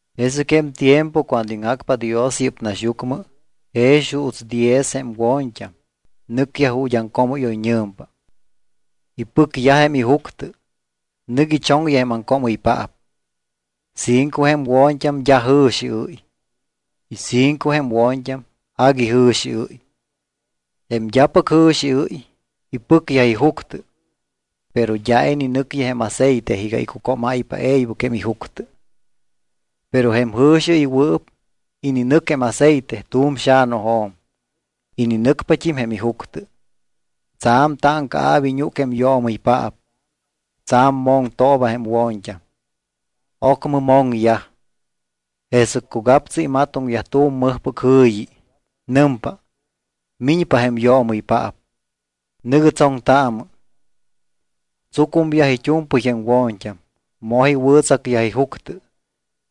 ’Jesɨc jém tiempo cuando iŋjacpa Dios yɨ́p naxyucmɨ jex juuts diez jém wo̱ñt́am nɨcyaj ju̱t́ aŋcoomɨ́yoyñɨ̱mpa. Ipɨcyaj jém ijuctɨ, nɨc ichoŋyaj jém aŋcoomɨypaap. Cinco jém wo̱ñt́am d́a jɨ̱xiɨ́y y cinco jém wo̱ñt́am agui jɨ̱xiɨ́y. Jém d́apɨc jɨ̱xiɨ́y ipɨcyaj ijuctɨ, pero d́a ininɨcyaj jém aceite iga icucómáypa e̱ybɨc jém ijuctɨ. Pero jém jɨ̱xiɨywɨɨp ininɨc jém aceite tu̱m xa̱nujo̱m. Ininɨcpat́im jém ijuctɨ. Tsa̱m táŋcaa̱p iñúc jém yoomɨypaap. Tsa̱m moŋtooba jém wo̱ñt́am. Ocmɨ moŋyaj. Jesɨc cugaptsu imatoŋyaj tu̱m mɨjpɨc jɨ̱yi. Nɨmpa: “Miñpa jém yoomɨypaap. Nɨ̱gɨ tsoŋtaamɨ.” Tsucumyaj it́u̱mpɨy jém wo̱ñt́am. Moj iwɨ̱tsacyaj ijuctɨ.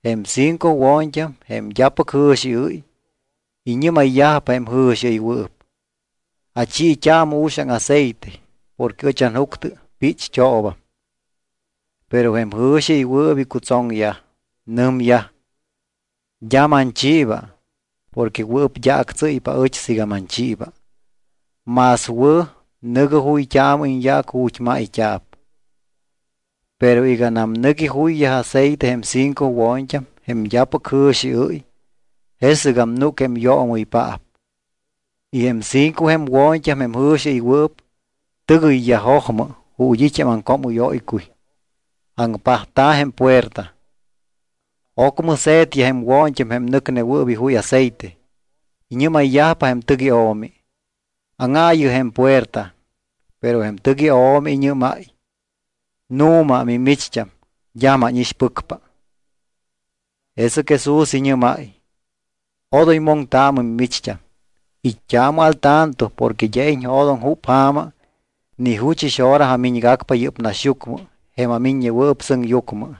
Jém cinco wo̱ñt́am, jém d́apɨc jɨ̱xiɨ́y, iñɨ́mayyajpa jém jɨ̱xiɨywɨɨp: “Achiit́aamɨ uxaŋ aceite porque ɨch anjuctɨ pícht́oobam.” Pero jém jɨ̱xiɨywɨɨp icutsoŋyaj. Nɨmyaj: “D́a manchiiba porque wɨɨp d́a actsɨ́ypa aɨch siiga manchiiba. Más wɨ̱ nɨ̱gɨ juyt́aamɨ iñyaac ju̱t́ mayt́a̱p.” Pero iganam nɨc ijuyyaj aceite jém cinco wo̱ñt́am, jém d́apɨc jɨ̱xiɨ́y, jesɨgam núc jém yoomɨypaap. Y jém cinco jém wo̱ñt́am jém jɨ̱xiɨywɨɨp tɨgɨyyaj jojmɨ ju̱t́ it́ jém aŋcoomɨ́yóycuy. Aŋpajta̱ jém puerta. Ocmɨ se̱tyaj jém wo̱ñt́am jém nɨcnewɨɨp ijuy aceite. Iñɨ́mayyajpa jém tɨc io̱mi: “Áŋaayɨ jém puerta.” Pero jém tɨc io̱mi iñɨ́máy: “Nu̱ma mimicht́am, d́a mánixpɨcpa.” Jesɨc Jesús iñɨ́máy: —Odoy moŋtaamɨ mimicht́am, it́t́aamɨ al tanto porque d́a iñjo̱doŋ júp ja̱ma ni juchɨs hora amiñgacpa yɨ́p naxyucmɨ jém aMiññewɨɨp Sɨŋyucmɨ.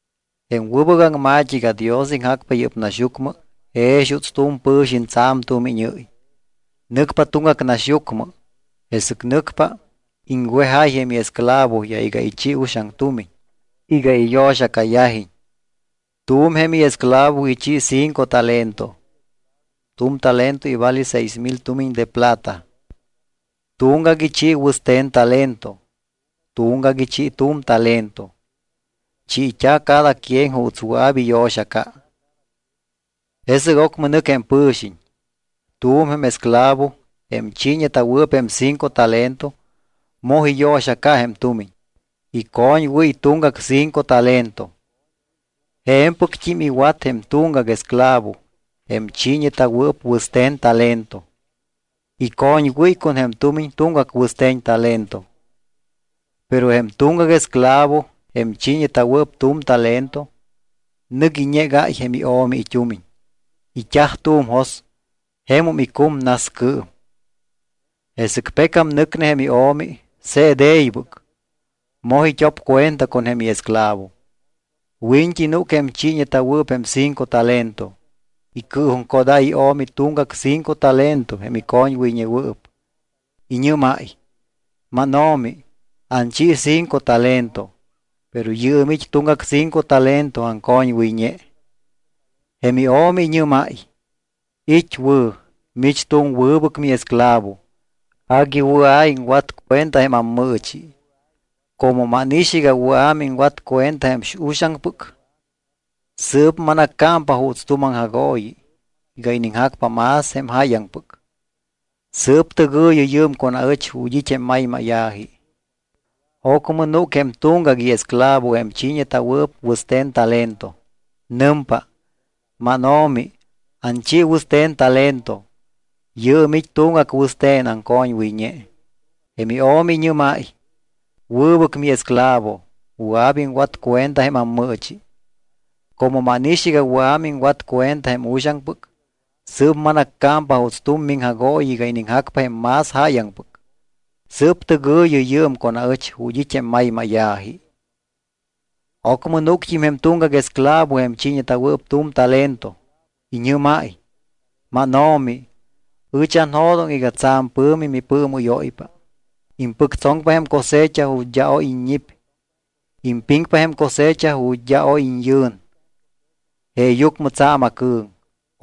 ’Jém wɨbɨc aŋma̱t́i iga Dios iŋjacpa yɨ́p naxyucmɨ jex juuts tu̱m pɨ̱xiñ tsa̱m tumiñɨ́y. Nɨcpa tuŋgac naxyucmɨ. Jesɨc nɨcpa, iŋwejáy jém iesclavoyaj iga ichi uxaŋ tumiñ iga iyo̱xacayajiñ. ’Tu̱m jém iesclavo ichi cinco talento (tu̱m talento ivale seis mil tumiñ de plata). Tuŋgac ichi wɨste̱n talento. Tuŋgac ichi tu̱m talento. Chiit́a̱ cada quien juuts wɨa̱p iyo̱xaca. Jesɨc ocmɨ nɨc jém pɨ̱xiñ. Tu̱m jém esclavo, jém chiiñeta̱wɨɨp jém cinco talento, moj iyo̱xaca jém tumiñ. Icoñwɨ́y tuŋgac cinco talento. Je̱mpɨct́im iwat jém tuŋgac esclavo, jém chiiñeta̱wɨɨp wɨste̱n talento. Icoñwɨ́y con jém tumiñ tuŋgac wɨste̱n talento. Pero jém tuŋgac esclavo, jém chiiñeta̱wɨɨp tu̱m talento, nɨc iñegáy jém io̱mi it́umiñ. It́aj tu̱m jos, jemum icum nascɨɨm. ’Jesɨc pecam nɨcne jém io̱mi, se̱t e̱ybɨc. Moj it́op cuenta con jém iesclavo. Wiñt́i núc jém chiiñeta̱wɨɨp jém cinco talento. Icɨɨjuŋcodáy io̱mi tuŋgac cinco talento jém icoñwɨyñewɨɨp. Iñɨ́máy: “Máno̱mi, anchi cinco talento, pero yɨɨm it́ tuŋgac cinco talento aŋcoñwɨyñe.” Jém io̱mi iñɨ́máy: “It́ wɨ̱. Mich tu̱m wɨbɨc miesclavo, agui wɨa̱ iŋwat cuenta jém ammɨɨchi. Como mánix iga wɨa̱ miŋwat cuenta jém uxaŋpɨc, sɨɨp manaccámpa juuts tu̱m aŋjagooyi iga iniŋjacpa más jém jáyaŋpɨc. Sɨɨp tɨgɨ̱yɨ yɨɨm con aɨch ju̱t́ it́ jém maymáya̱ji.” ’Ocmɨ núc jém tuŋgac iesclavo jém chiiñeta̱wɨɨp wɨste̱n talento. Nɨmpa: “Máno̱mi, anchi wɨste̱n talento. Yɨɨm it́ tuŋgac wɨste̱n aŋcoñwɨyñe.” Jém io̱mi iñɨ́máy: “Wɨbɨc miesclavo, wɨa̱p iŋwat cuenta jém ammɨɨchi. Como mánix iga wɨa̱ miŋwat cuenta jém uxaŋpɨc, sɨɨp manaccámpa juuts tu̱m miŋjagooyi iga iniŋjacpa jém más jáyaŋpɨc. Sɨɨp tɨgɨ̱yɨ yɨɨm con aɨch ju̱t́ it́ jém maymáya̱ji.” ’Ocmɨ núct́im jém tuŋgac esclavo jém chiiñeta̱wɨɨp tu̱m talento. Iñɨ́máy: “Máno̱mi, ɨch anjo̱doŋ iga tsa̱m pɨ̱mi mipɨɨmɨ́yóypa. Impɨctsoŋpa jém cosecha ju̱t́ d́a oy iññip. Impiŋpa jém cosecha ju̱t́ d́a oy iñyɨn. Jeeyucmɨ tsa̱m acɨ̱ŋ.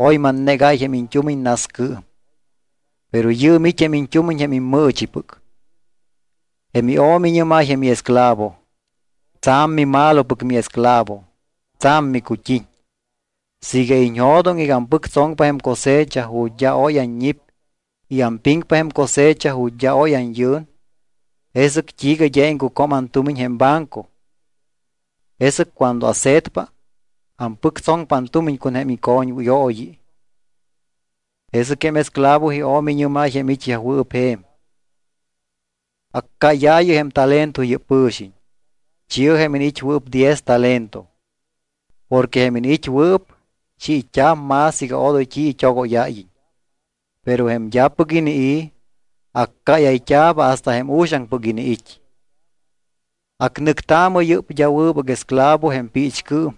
Oy mannegáy jém iñt́umiñ nascɨɨm. Pero yɨɨm it́ jém iñt́umiñ jém immɨɨchipɨc.” Jém io̱mi iñɨ́máy jém iesclavo: “Tsa̱m mimalopɨc miesclavo, tsa̱m micut́iñ. Siiga iñjo̱doŋ iga ampɨctsoŋpa jém cosecha ju̱t́ d́a oy anñip y ampiŋpa jém cosecha ju̱t́ d́a oy anyɨn, ¿jesɨc t́iiga d́a iŋcucom antumiñ jém banco? Jesɨc cuando ase̱tpa, ampɨctsoŋpa antumiñ con jém icoñwɨyooyi.” ’Jesɨc jém esclavo io̱mi iñɨ́máy jém it́yajwɨɨp je̱m: “Accáyaayɨ jém talento yɨ́p pɨ̱xiñ. Chi̱ɨ jém iniit́wɨɨp diez talento. Porque jém iniit́wɨɨp, chiit́a̱p más iga odoy t́i it́ogóyáyiñ. Pero jém d́apɨc inii̱, accáyayt́a̱p hasta jém uxaŋpɨc iniit́. Acnɨctaamɨ yɨ́p d́a wɨbɨc esclavo jém piichcɨɨm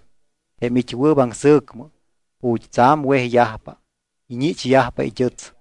jém it́wɨɨp aŋsɨ̱cmɨ, ju̱t́ tsa̱m wejyajpa, iñichyajpa it́ɨts.”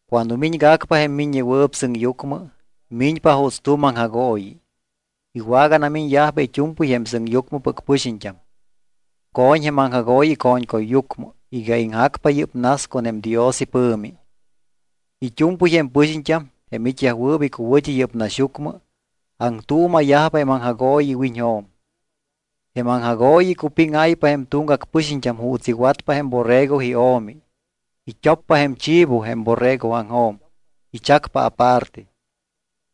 ’Cuando miñgacpa jém Miññewɨɨp Sɨŋyucmɨ, miñpa juuts tu̱m aŋjagooyi. Iwaganamiñyajpa it́u̱mpɨy jém sɨŋyucmɨpɨc pɨxiñt́am. Co̱ñ jém aŋjagooyi ico̱ñcuyyucmɨ iga iŋjacpa yɨ́p nas con jém Dios ipɨ̱mi. It́u̱mpɨy jém pɨxiñt́am, jém it́yajwɨɨp icuwɨ̱t́i yɨ́p naxyucmɨ, aŋtuuma̱yajpa jém aŋjagooyi iwiñjo̱m. Jém aŋjagooyi icupíŋáypa jém tuŋgac pɨxiñt́am juuts iwatpa jém borrego io̱mi. It́oppa jém chivo jém borregoaŋjo̱m, ichacpa aparte.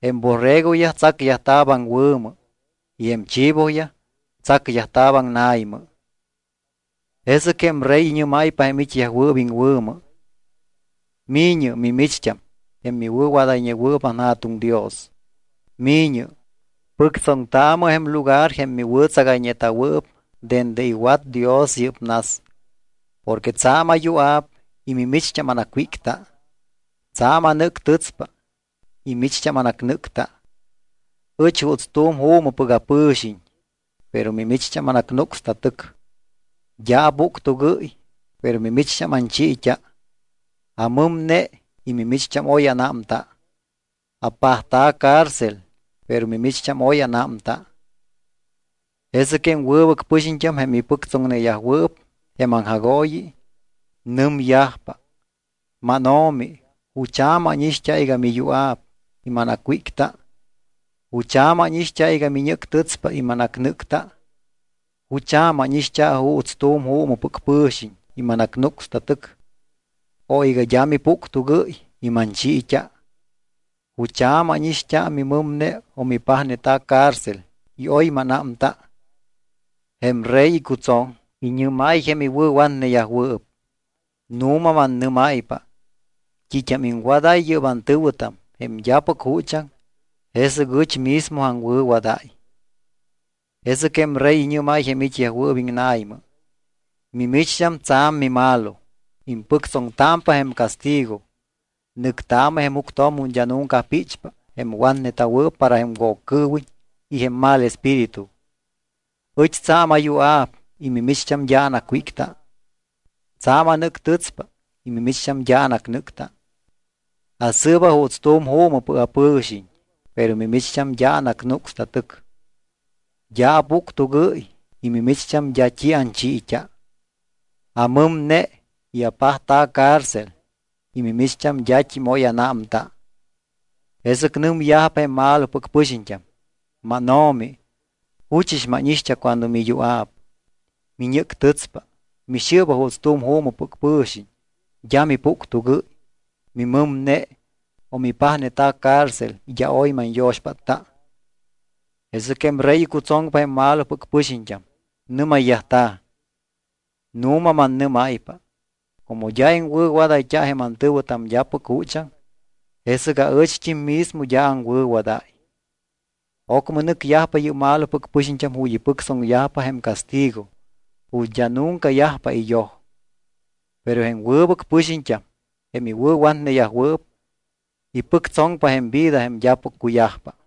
Jém borregoyaj tsacyajta̱p aŋwɨ̱mɨ y jém chivoyaj tsacyajta̱p aŋna̱ymɨ. ’Jesɨc jém Rey iñɨ́máypa jém it́yajwɨɨp iŋwɨ̱mɨ: “Mi̱ñɨ mimicht́am jém miwɨ̱wadayñewɨɨp anJa̱tuŋ Dios. Mi̱ñɨ, pɨctsoŋtaamɨ jém lugar jém miwɨ̱tsagayñeta̱wɨɨp dende iwat Dios yɨ́p nas. Porque tsa̱m ayua̱p y mimicht́am anacwícta. Tsa̱m anɨ́ctɨtspa y micht́am anacnɨ́cta. Ɨch juuts juumɨpɨc apɨ̱xiñ, pero mimicht́am anacnúcsta tɨc. D́a apuctugɨ́y, pero mimicht́am anchiit́a. Amɨmne y mimicht́am oy anámta. Apajta̱ cárcel, pero mimicht́am oy anámta.” ’Jesɨc jém wɨbɨc pɨxiñt́am, jém iwɨ̱pɨctsoŋneyajwɨɨp jém aŋjagooyi, nɨmyajpa: “MánO̱mi, ¿jucha̱ mánixt́a iga miyua̱p y manacwícta? ¿Jucha̱ mánixt́a iga miñɨ́ctɨtspa y manacnɨ́cta? ¿Jucha̱ mánixt́a juuts tu̱m juumɨpɨc mipɨ̱xiñ y manacnúcsta tɨc, o iga d́a mipuctugɨ́y y manchiit́a? ¿Jucha̱ mánixt́a mimɨmne o mipajneta̱ cárcel y oy mánámta?” Jém Rey icutsoŋ, iñɨ́máy jém iwɨ̱watneyajwɨɨp: “Nu̱ma, mannɨ́máypa, t́it́am iŋwadáy yɨ́p antɨ̱wɨtam, jém d́apɨc juchaŋ, jesɨc ɨch mismo aŋwɨ̱wadáy.” ’Jesɨc jém Rey iñɨ́máy jém it́yajwɨɨp iŋna̱ymɨ: “Mimicht́am tsa̱m mimalo, impɨctsoŋtámpa jém castigo. Nɨctaamɨ jém juctjo̱m ju̱t́ d́a nunca píchpa jém watneta̱wɨɨp para jém Woccɨɨwiñ y jém mal espíritu. Ɨch tsa̱m ayua̱p y mimicht́am d́a anacwícta. Tsa̱m anɨ́ctɨtspa y mimicht́am d́a anacnɨ́cta. Asɨɨba juuts tu̱m juumɨpɨc apɨ̱xiñ, pero mimicht́am d́a anacnúcsta tɨc. D́a apuctugɨ́y y mimicht́am d́a t́i anchiit́a. Amɨmne y apajta̱ cárcel y mimicht́am d́at́im oy anámta.” Jesɨc nɨmyajpa jém malopɨc pɨxiñt́am: “MánO̱mi, ¿juchɨs mánixt́a cuando miyua̱p, miñɨ́ctɨtspa, mixɨɨba juuts tu̱m juumɨpɨc pɨ̱xiñ, d́a mipuctugɨ́y, mimɨmne, o mipajneta̱ cárcel y d́a oy manyo̱xpátta?” Jesɨc jém Rey icutsoŋpa jém malopɨc pɨxiñt́am. Nɨ́mayyajta̱: “Nu̱ma mannɨ́máypa, como d́a iŋwɨ̱wadayt́a jém antɨ̱wɨtam d́apɨc juchaŋ, jesɨc ɨcht́im mismo d́a aŋwɨ̱wadáy.” Ocmɨ nɨcyajpa yɨ́p malopɨc pɨxiñt́am ju̱t́ ipɨctsoŋyajpa jém castigo ju̱t́ d́a nunca yajpa iyoj. Pero jém wɨbɨc pɨxiñt́am, jém iwɨ̱watneyajwɨɨp, ipɨctsoŋpa jém vida jém d́apɨc cuyajpa.